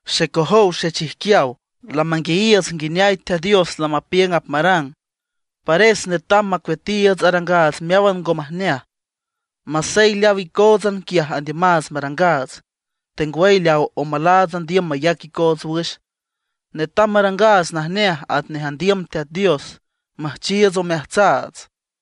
Xecojow xechijquiaw, lamanguiayiiüts nguineay Teat Dios lamapiüng apmarang; pares netam macueatiiüts arangaats meáwan ngo majneaj, masey leaw icóotsan quiaj andiümaats marangaats, tengwüy leaw omalaats andiüm mayac icoots wüx. Netam marangaats najneaj atnej andiüm Teat Dios, müjchiiüts omeajtsaats.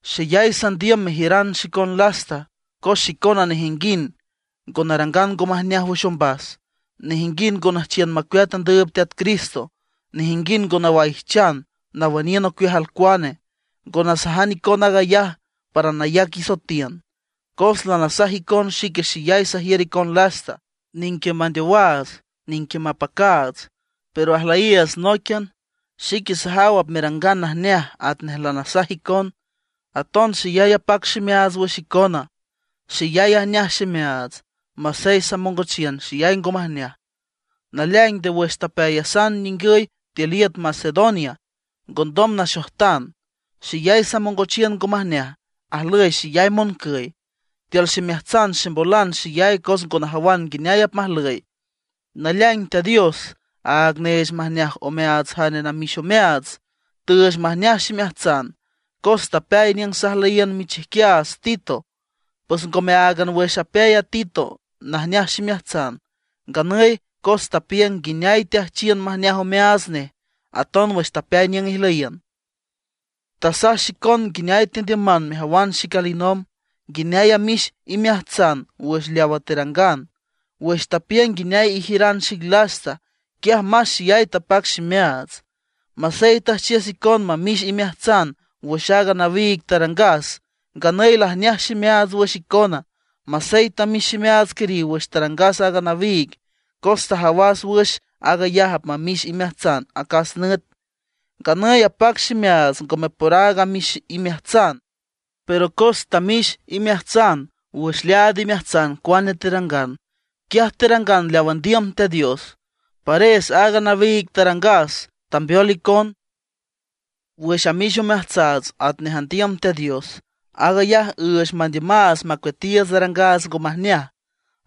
Xeyay sandiüm mejiüran xicon lasta, cos xicona nejinguind ngo narangan ngo majneaj wüx ombas; nejinguind ngo nüjchiün macueat andüüb Teat Cristo; nejinguind ngo nawaijchan nawüniün ocueaj alcuane. Ngo nasaj icon aag ayaj para nayac isoetiün, cos lanasaj icon xique xeyay sajiür icon lasta. Nique mandeowaats, nique mapacaats, pero ajlüyiiüts nóiquian. Xique sajaw apmerangan najneaj atnej lanasaj icon. Aton xeyay apac ximeaats wüx icona, xeyay ajneaj ximeaats, masey samongochiün xeyay ngo majneaj. Naleaing, nde wüx tapeayasan ningüy tiül iüt Macedonia ngondom naxojtan. Xeyay samongochiün ngo majneaj, ajlüy xeyay moncüy. Tiül ximeajtsan ximbolan xeyay cos ngo najawan nguineay apmajlüy. Naleaing Teat Dios, áag neech majneaj omeaats jane namix omeaats, tüüch majneaj ximeajtsan, cos tapeay niüng sajlüyiün michijquiaats Tito. Pues ngome áagan wüx apeay a Tito najneaj ximeajtsan, nganüy cos tapiüng nguineay teajchiün majneaj omeaats nej aton wüx tapeay niüng ijlüyiün. Tasaj xicon nguineay tendiüman mejawan xic alinomb, nguineay amix imeajtsan wüx leawa terangan. Wüx tapiüng nguineay ijiüran xic lasta, quiaj más xeyay tapac ximeaats. Masey tüjchiüs icon mamix imeajtsan wüx aaga nawiig tarangas, nganüy lajneaj ximeaats wüx icona. Masey tamix ximeaats quiriw wüx tarangas aaga nawiig, cos tajawas wüx aag ayaj apmamix imeajtsan acas nüt. Nganüy apac ximeaats ngome por aaga amix imeajtsan, pero cos tamix imeajtsan wüx leaad imeajtsan cuane terangan. Quiaj terangan leaw andiüm Teat Dios. Pares aaga nawiig tarangas tambeol icon. Wüx amix omeajtsaats atnej andiüm Teat Dios, aag ayaj üüch mandiümaats macueatiiüts arangaats ngo majneaj;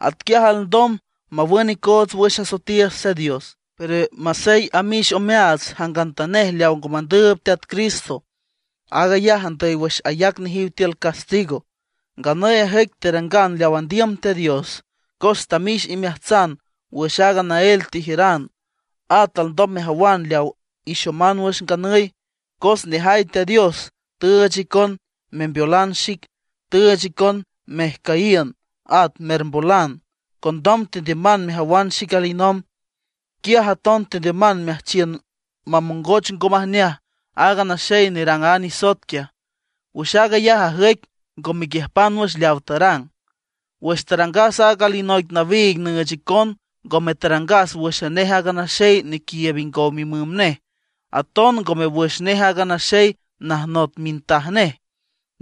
atquiaj alndom mawün icoots wüx asoetiiüts Teat Dios. Pero masey amix omeaats jangantanej leawa ngo mandüüb Teat Cristo aag ayaj andüy wüx ayac nejiw tiül castigo. Nganüy ajüic terangan leaw andiüm Teat Dios, cos tamix imeajtsan wüx aaga naél tejiüran. At alndom mejawan leaw ixoman wüx nganüy, cos nejay Teat Dios tüüch icon membeolan xic, tüüch icon mejcüyiün, at mermbolan; condom tendiüman mejawan xic alinomb. Quiaj aton tendiüman meajchiün mamongoch ngo majneaj aaga naxey nerang a nisoet quiaj. Wüx aag ayaj ajüic ngo mequiüjpan wüx leaw tarang. Wüx tarangas aaga alinoic nawiig nüüch icon, ngome tarangas wǘxan nej aaga naxey nequiiüb ingow mimüm nej, aton ngome wüx nej aaga naxey najnot mintaj nej.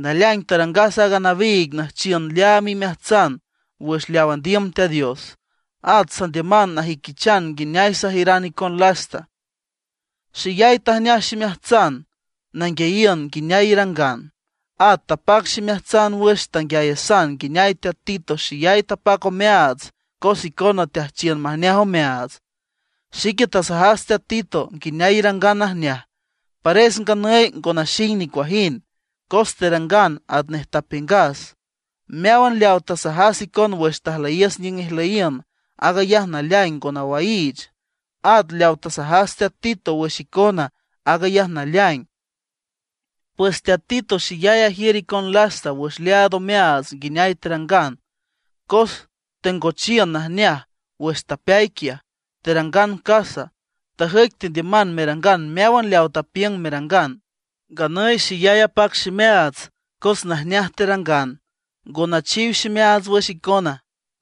Naleaing tarangas aaga nawiig nüjchiün leaam imeajtsan wüx leaw andiüm Teat Dios; at sandiüman najüiquichan nguineay sajiüran icon lasta. Xeyay tajneaj ximeajtsan nanguiayiün nguineay irangan. At tapac ximeajtsan wüx tanguiayasan nguineay teat Tito xeyay tapac omeaats cos icona teajchiün majneaj omeaats. Xique tasajas teat Tito nguineay irangan najneaj, pares nganüy ngo naxing nicuajind, cos terangan atnej tapiüngas. Meáwan leaw tasajas icon wüx tajlüyiüs niüng ijlüyiün, aag ayaj naleaing ngo nawaiich. At leaw tasajas teat Tito wüx icona, aag ayaj naleaing. Pues teat Tito xeyay ajiür icon lasta wüx leaad omeaats nguineay terangan, cos tengochiün najneaj wüx tapeay quiaj, terangan casa. Tajüic tendiüman merangan meáwan leaw tapiüng merangan. Nganüy xeyay apac ximeaats cos najneaj terangan, ngo nachiw ximeaats wüx icona.